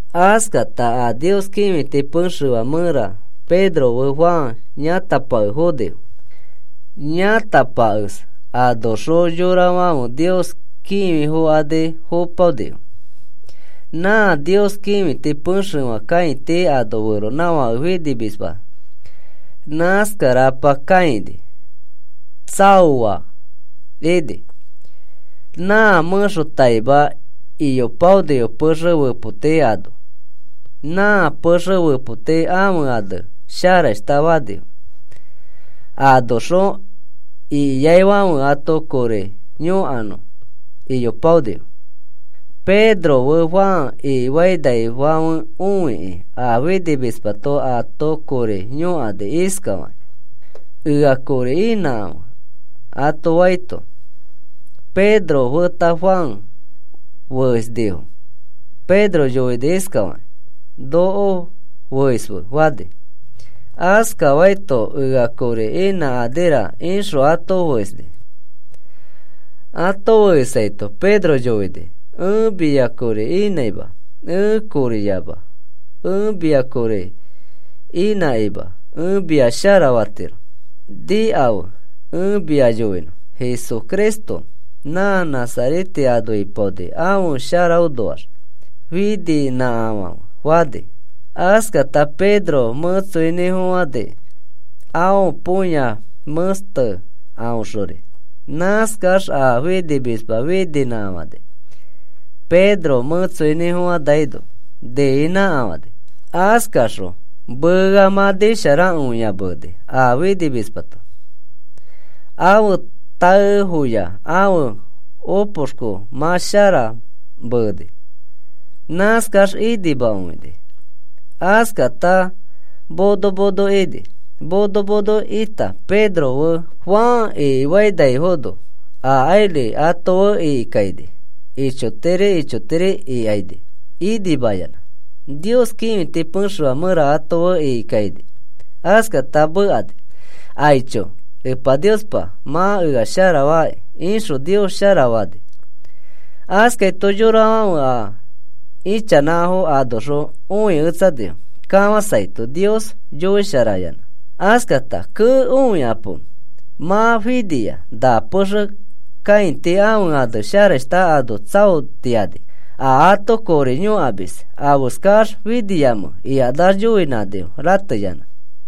Askata a Nios kĩfiti pexefã mẽra Pedro fe Juan yãtapake fonifo. Yãtapakes anoxõ yorafãfe Nios kĩfifokani fopaonifo. Nã Nios kĩfiti pexefã kãiti ano feronãfake finimisma nãskarapa kãini tsaoa ini. Nã mẽxotaima iyopaonifo pexe fepoti ano, nã pexe fepotinĩ afe ane “Sharashta” fanifo. Anoxõ ikiaifãfe ato kori yõkanõ iyopaonifo. Pedro fe Juan ikifainaifãfe õikĩ a finimismato ato kori yõkani iskafakĩ: “Ea kori inãkãfe,” ato faito, Pedro feta Juan feesnifo. Pedro yoini iskafakĩ: “Noko feisfe,” fani. Askafaito, “Ea kori inãkanira,” ixõ ato feisni. Ato feisaito Pedro yoini: “Ẽ mia kori inãima. Ẽ koriyama. Ẽ mia kori inãkima ẽ mia sharafatiro. Nikafe, ẽ mia yoinõ. Jesucristo nã Nazarete ano ipaoni ãfe sharaõnoax fininãkafãfe,” fani. Askata Pedro mẽtsoinĩfofãni aõ põya mẽste aõxori. Nãskax a finimisma fininãkafani. Pedro mẽtsoinĩfofãnaino niinãkafãni. Askaxõ mea mã nisharakõia meeni a finimismato. Ãfe taefoya ãfe opoxko mã shara meeni. Nãskax inimakõini. Askata mono mono ini. Mono mono ita Pedro fe Juan ikifainaifono, akairi ato fe ikikaini ichotiri ichotiri ikani inimayanã. Nios kĩfiti pexefã mẽra ato fe ikikaini. Askata mekani: “Aicho, Niospa mã ea sharafaki,” ixõ Nios sharafani. Askaito yorafãfe a ichanãfo anoxõ õiketsanifo kafãsaito Nios yoisharayanã. Askata, “Kee, õikapo. Mã finia, na pexe kãiti ãfe ane ‘Sharashta’ ano tsaotiani, a ato kori yõkamis. ¿Afeskax finiamẽ?” ikanax yoinãnifo, rateyanã.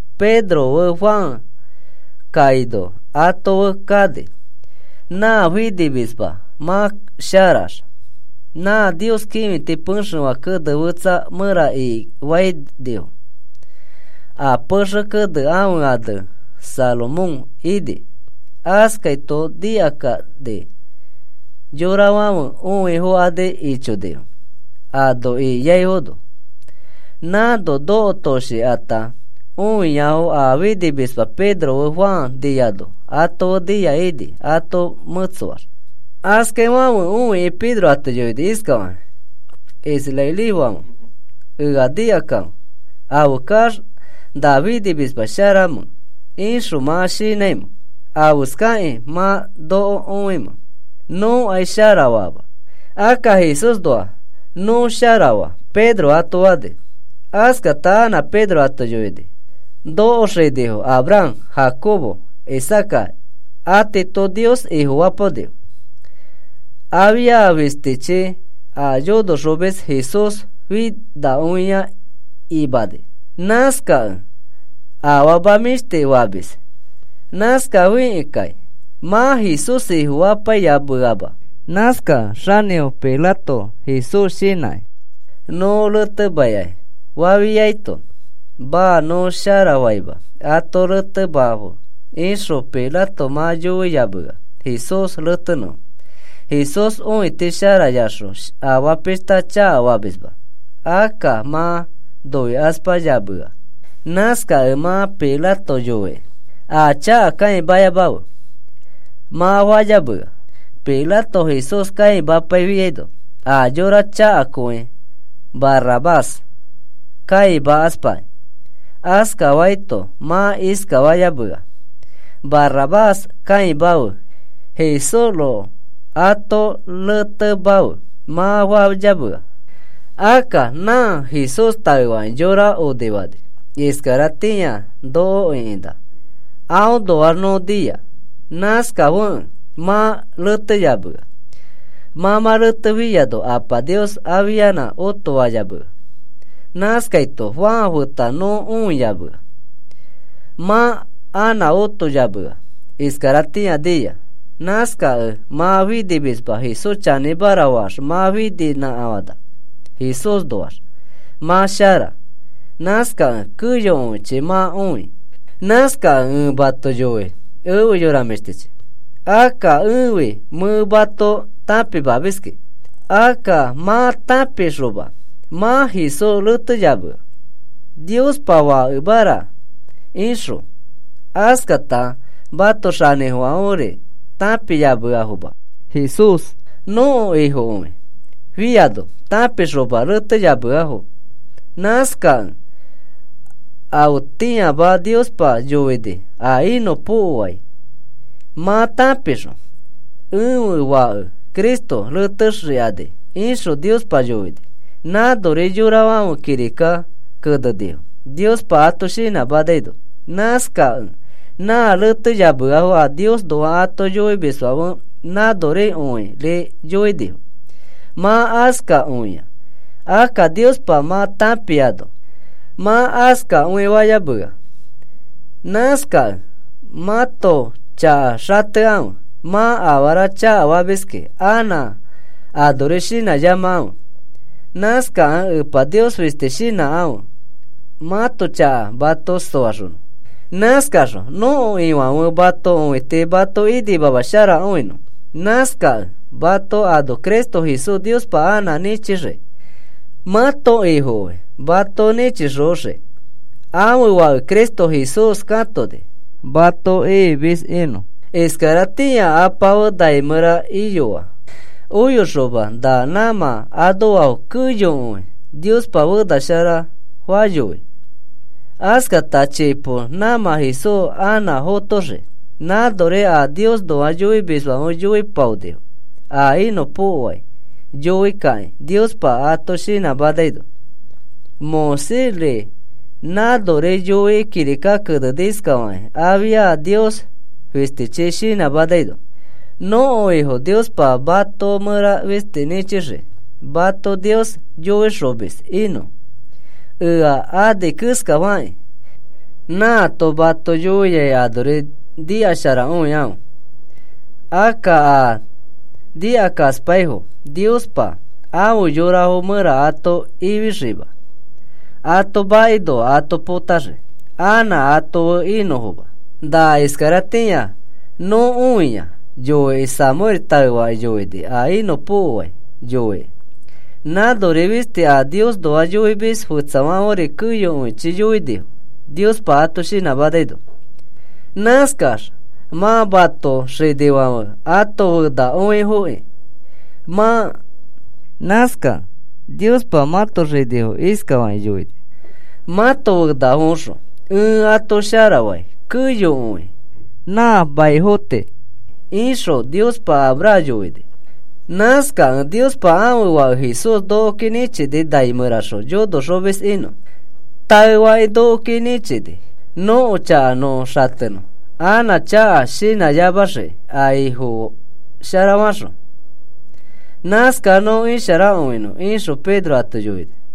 Pedro fe Juan kaino ato fe kani nã finimisma mã sharax. Nã Nios kĩfiti pexefã kene fetsa mẽra ikifainifo. A pexe kene ãfe ane “Salomón” ini. Askaito nikakani yorafãfe õifokani ichonifo ano ikiafono. Nãno nokotoshikata õiafo a finimisma Pedro fe Juan niano ato fe nia ini ato mẽtsoax. Askaifãfe õikĩ Pedro ato yoini iskafakĩ: “Israelifãfe, ea nikakãfe. ¿Afeskax nã finimisma sharamẽ ixõ mã shinãimẽ? ¿Afeskakĩ mã noko õimẽ? Nõkai sharafama. Akka Jesúsxõ nõ sharafaa,” Pedro ato fani. Askata anã Pedro ato yoini: “Nõko xinifo Abraham, Jacobo, Isaaca atiito Nios Ifofapaonifo. Afia fistichi a yonoxomis Jesús finakõia imani. Nãskakẽ afama mĩshti famis. Nãskafikẽkai mã Jesús Ifofapaiyameama. Nãskakẽ xanĩfo Pilato Jesús shinãkĩ, ‘Nõ reteimakai’ fafiaito, ‘Maa, nõ sharafaima, ato retemafe,’ ixõ Pilato mã yoiyamea, Jesús retenõfo. Jesús õiti sharayaxõ afaa pishta chakafamisma, akka mã noikaspayamea. Nãskakẽ mã Pilato yoikĩ: ‘A chaka kãimayamafe,’ mã fayamea. Pilato Jesús kãimapaifiaino a yora chakakõi Barrabás kãimakaspakĩ. Askafaito mã iskafayamea: ‘Barrabás kãimafe, Jesúsroko ato retemafe,’ mã fayamea. Akka nã Jesús taefakĩ yora onifani, iskaratĩari noko ĩkinã, aõnoax nõ nia. Nãskafekẽ mã reteyamea. Mã mã retefiano Apa Niospa afianã otofayamea. Nãskaito Juan feta nõ õiyamea. Mã anã otoyamea. Iskaratĩa nia. Nãskakẽ nã finimisma Jesús chanĩmara faax mã fininãkafãna. Jesúsnoax mã shara. Nãskakẽ keyokõichi mã õi. “Nãskakẽ ẽ mato yoi, efe yora mĩshtichi. Akka ẽfi mẽ mato tãpimiskĩ. Akka mã tãpixoma mã Jesús reteyamea, ‘Niospa Fakemara,’ ixõ. Askata mãto xanĩfofofãferi tãpiyameafoma. Jesús nõko Ifokõi fiano tãpixoma reteyameafo. Nãskakẽ afetĩama Niospa yoini a inõpokoai mã tãpixõ: ‘Ẽfe Fake Cristo retexikani,’ ixõ Niospa yoini. Nãnori yorafãfe kirika kenenifo, Niospa ato shinãmanaino. Nãskakẽ mã reteyameafo a Niosnoa ato yoimisfãfe nãnorikõiri yoinifo. Mã askakõia. Akka Niospa mã tãpiano, mã askakõifayamea. Nãskakẽ mãto chaka xatekãfe. Mã afara chakafamiskĩ anã anori shinãyamakãfe. Nãskakẽ Epa Nios fisti shinãkãfe, mãto chaka mato soaxonõ. Nãskaxõ nõko Ifãfe mãto õiti mato inimamasharakõinõ. Nãskakẽ mato ano Cristo Jesús Niospa anã nĩchixii, mãto Ifokõi mato nĩchixoxii. Ãfe Fake Cristo Jesús katoni mato ifimis inõ. Iskaratĩa Apa fe nai mẽra iyoa, oyoxoma na nãmã anoafo keyokõi Niospa fena shara fayoi. Askata chipo nãmã Jesús anã fotoxii. Nãnori a Niosnoa yoimisfãfe yoiyopaonifo a inõpokoai yoi kakĩ, Niospa ato shinãmanaino. Moisésri nãnori yoikĩ kirika keneni iskafakĩ afia Nios fistichi shinãmanaino: ‘Nõko Ifo Niospa mato mẽra fisti nĩchixii mato Nios yoixomis inõ, ea ani keskafakĩ. Nãato mato yoiai anori nikasharakõikãfe. Akka a nikakaspaifo Niospa afe yorafo mẽra ato ifixiima. Ato makinoa ato potaxii anã ato fe inõfoma.’ Na iskaratĩa nõ õiai yoikĩ Samuel taefakĩ yoini a inõpokoai yoikĩ. Nãnori fisti a Niosnoa yoimis fetsafãferi keyokõichi yoinifo Niospa ato shinãmanaino. Nãskax mã mãto xinifãfe ãto fenakõifokĩ mã. Nãskakẽ Niospa mãto xinifo iskafakĩ yoini: ‘Mãto fenafoõxõ ẽ ato sharafai keyokõi nã maniafo tii,’ ixõ Niospa Abraham yoini. Nãskakẽ Niospa ãfe Fake Jesús nokoki nĩchini nai mẽraxõ yonoxomis inõ. Taefakĩ nokoki nĩchini nõko chaka nõ xatenõ anã chaka shinãyamaxiki a Ifo sharafaxõ. Nãskax nõ isharakõinõ,” ixõ Pedro ato yoini.